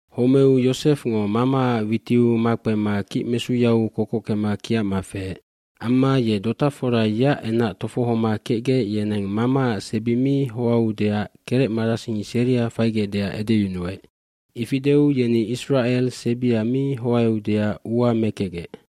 aHomeu Yosefngo mamaac witiu makpema kicmesuyau kokockema kiacma feec. Amma ye dotafora yeac enac tofohoma kecgec yeneng mamaac sebi mi hoaeudeac kerecmarasing seria faigecdeac edeyunuec. Ifi deu yeni Isracel sebia mi hoaeudeac ua mekecgec.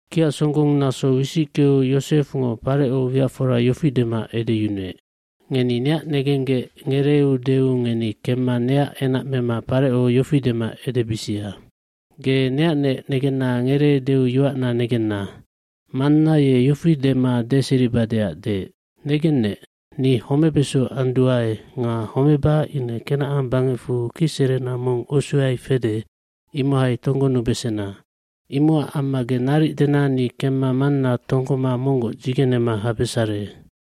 Kiacsonggonnaso wisickeu Yosefngo Pareco wiacfora yofi dema edeyunuec, “Ngeni neac negenggec ngereeudeu ngeni kemma neac enac mema Pareco yofi dema edebisia. c‘Ge neacnec negenna ngereedeu yoacna negenna. Manna ye yofi dema deseribadeac deec, “Negennec, ni homebeso anduae nga homeba ine Kenacan bangecfu kicserena mong usuyai fede imohai tonggonubesena.” Imocac amma ge naric dena ni kemma manna tonggoma monggoc dzigenema habesare.’”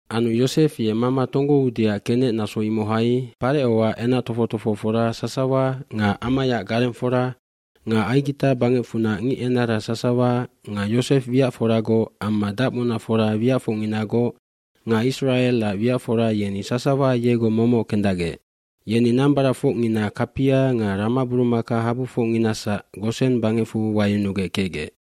Anu Yosef ye mama tonggoudeac kenec naso imohai Parecoac enac tofoc tofohofora sasawa nga amayaac garengfora nga Aigita bangecfunac ngicenara sasawa nga Yosef wiacforagoc amma dacmunafora wiacfocnginagoc nga Isracelac wiacfora yeni sasawa yegoc momoc kendacgec. Yeni nambaracfocngina kapia nga ramaburumakahabufocnginasac Gosen bangecfu wayunugec kecgec.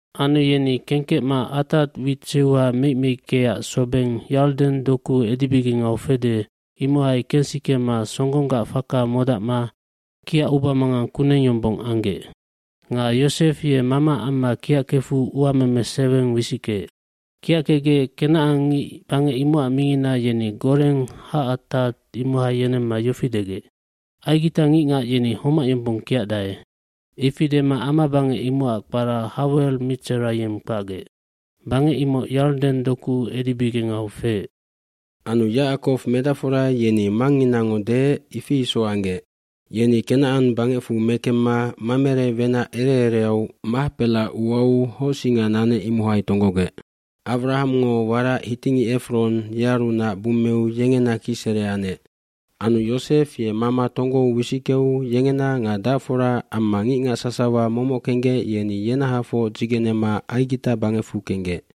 Anu yeni kengkecma Atad wit seuha meic meickeac sobengd Yarden doku edibigengau fede imohai kensikema songgonggac faka modacma kiac ubamangang kuneng yombong anggec. Nga Yosef ye mamaac amma kiackefu uameme seweng wisickeec. Kiackecgec kenacangngic bangec imocac mingina yeni Goren Hacatad imohai yenemma yofi degec, “Aigitangicngac yeni homac yombong kiacdae.” Ifi dema ama bangec imocac kpara Hawel Mitserayime kpacgec. Bangec imoc Yarden doku edibigengau feec. Anu Yacakow medacfora yeni mangnginango deec, ifi isoc anggec. fYeni Kenacan bangecfu mekemma Mamere wenac ereereau Mahpela uau hocsinga nanec imohai tonggogec. Awramngo warac hitingic Efron yearunac bummeu yengena kicsere anec. Anu Yosef ye mama tonggou wisickeu yengena nga dacfora amma ngicngac sasawa momoc kenggec yeni yenahafoc dzigenema Aigita bangecfu kenggec.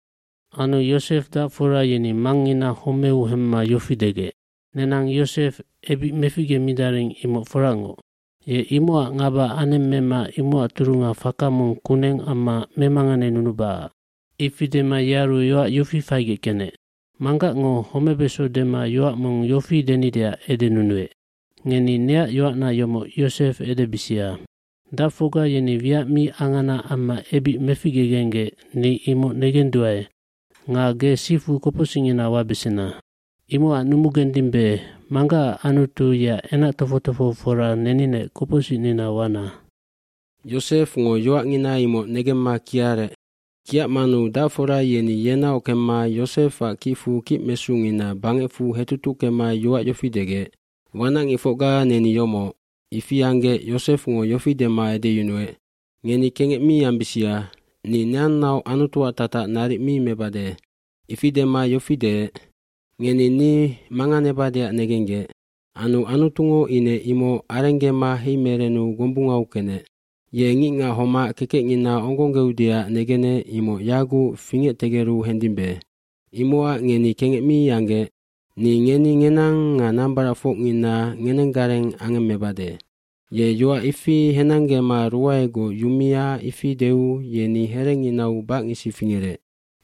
Anu Yosef dacfora yeni mangngina homeu hemma yofi degec, “Nenang Yosef ebic meficgemidaring imoc foracngoc. Ye imocac ngaba anemmema imocac turunga faka mong kuneng amma memanganenunubacac.” Ifi dema yearu yoac yofi faigec kenec, “Manggacngo homebeso dema yoac mong yofi denideac edenunuec, ‘Ngeni neac yoacna yomoc Yosef edebisia, “Dacfocga yeni wiac mi angana amma ebic meficgegenggec ni imoc negenduae nga ge sifu kopocsicngina wabesena.” ’ Imocac numugendimbe manggacac Anutu yeac enac tofoc tofohofora neninec kopocsicnina wabesena.” Yosefngo yoacngina imoc negemma kiarec. Kiacmanu dacfora yeni yenaoc kemma Yosefac kicfu kicmesungina bangecfu hetutuckema yoac yofi degec, “Wanacngicfocga neni yomoc.” Ifi anggec Yosefngo yofi dema edeyunuec, “Ngeni kengec mi ambisia. Ni neannaoc Anutuac tatac naric mi mebade.” gIfi dema yofi deec, “Ngeni ni manganebadeac negenggec. Anu Anutungo ine imoc arenggema heimerenu gombungau kenec. Ye ngicngac homac kekecngina onggonggeudeac negenec imoc yaguc fingectegeru hendimbe. Imocac ngeni kengec mi anggec. Ni ngeni ngenang nga nambaracfocngina ngenenggareng angemmebade.” Ye yoac ifi henanggema ruaegoc yumia ifi deu yeni herenginau bacngisi fingerec.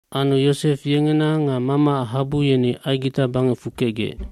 Anu Yosef yengena nga mamaac habu yeni Aigita bangecfu kecgec.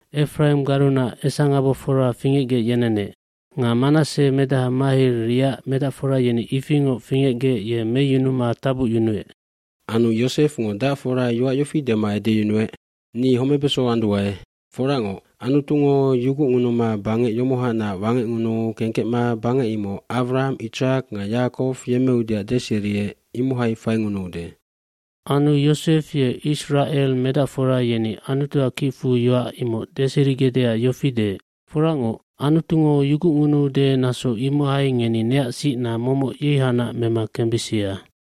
Efraimgarunac esangabofora fingecgec yenenec. Nga Manasse medaha Mahir yeac medacfora yeni ifingoc fingecgec ye meyunuma tabucyunuec. hAnu Yosefngo dacfora yoac yofi dema edeyunuec, “Ni homebeso anduae. Foracngoc, Anutungo yugucngunuma bangec yomohanac wangecngunuu kengkecma bangec imoc Awraham, Itsak nga Yacakow yemmeudeac deseriec imohai faingunuude.” iAnu Yosef ye Isracel medacfora yeni Anutuac kicfu yoac imoc deserigecdeac yofi deec, “Foracngoc, Anutungo yugucngunuude naso imohai ngeni neac sicna momoc yeihanac mema kembisia.”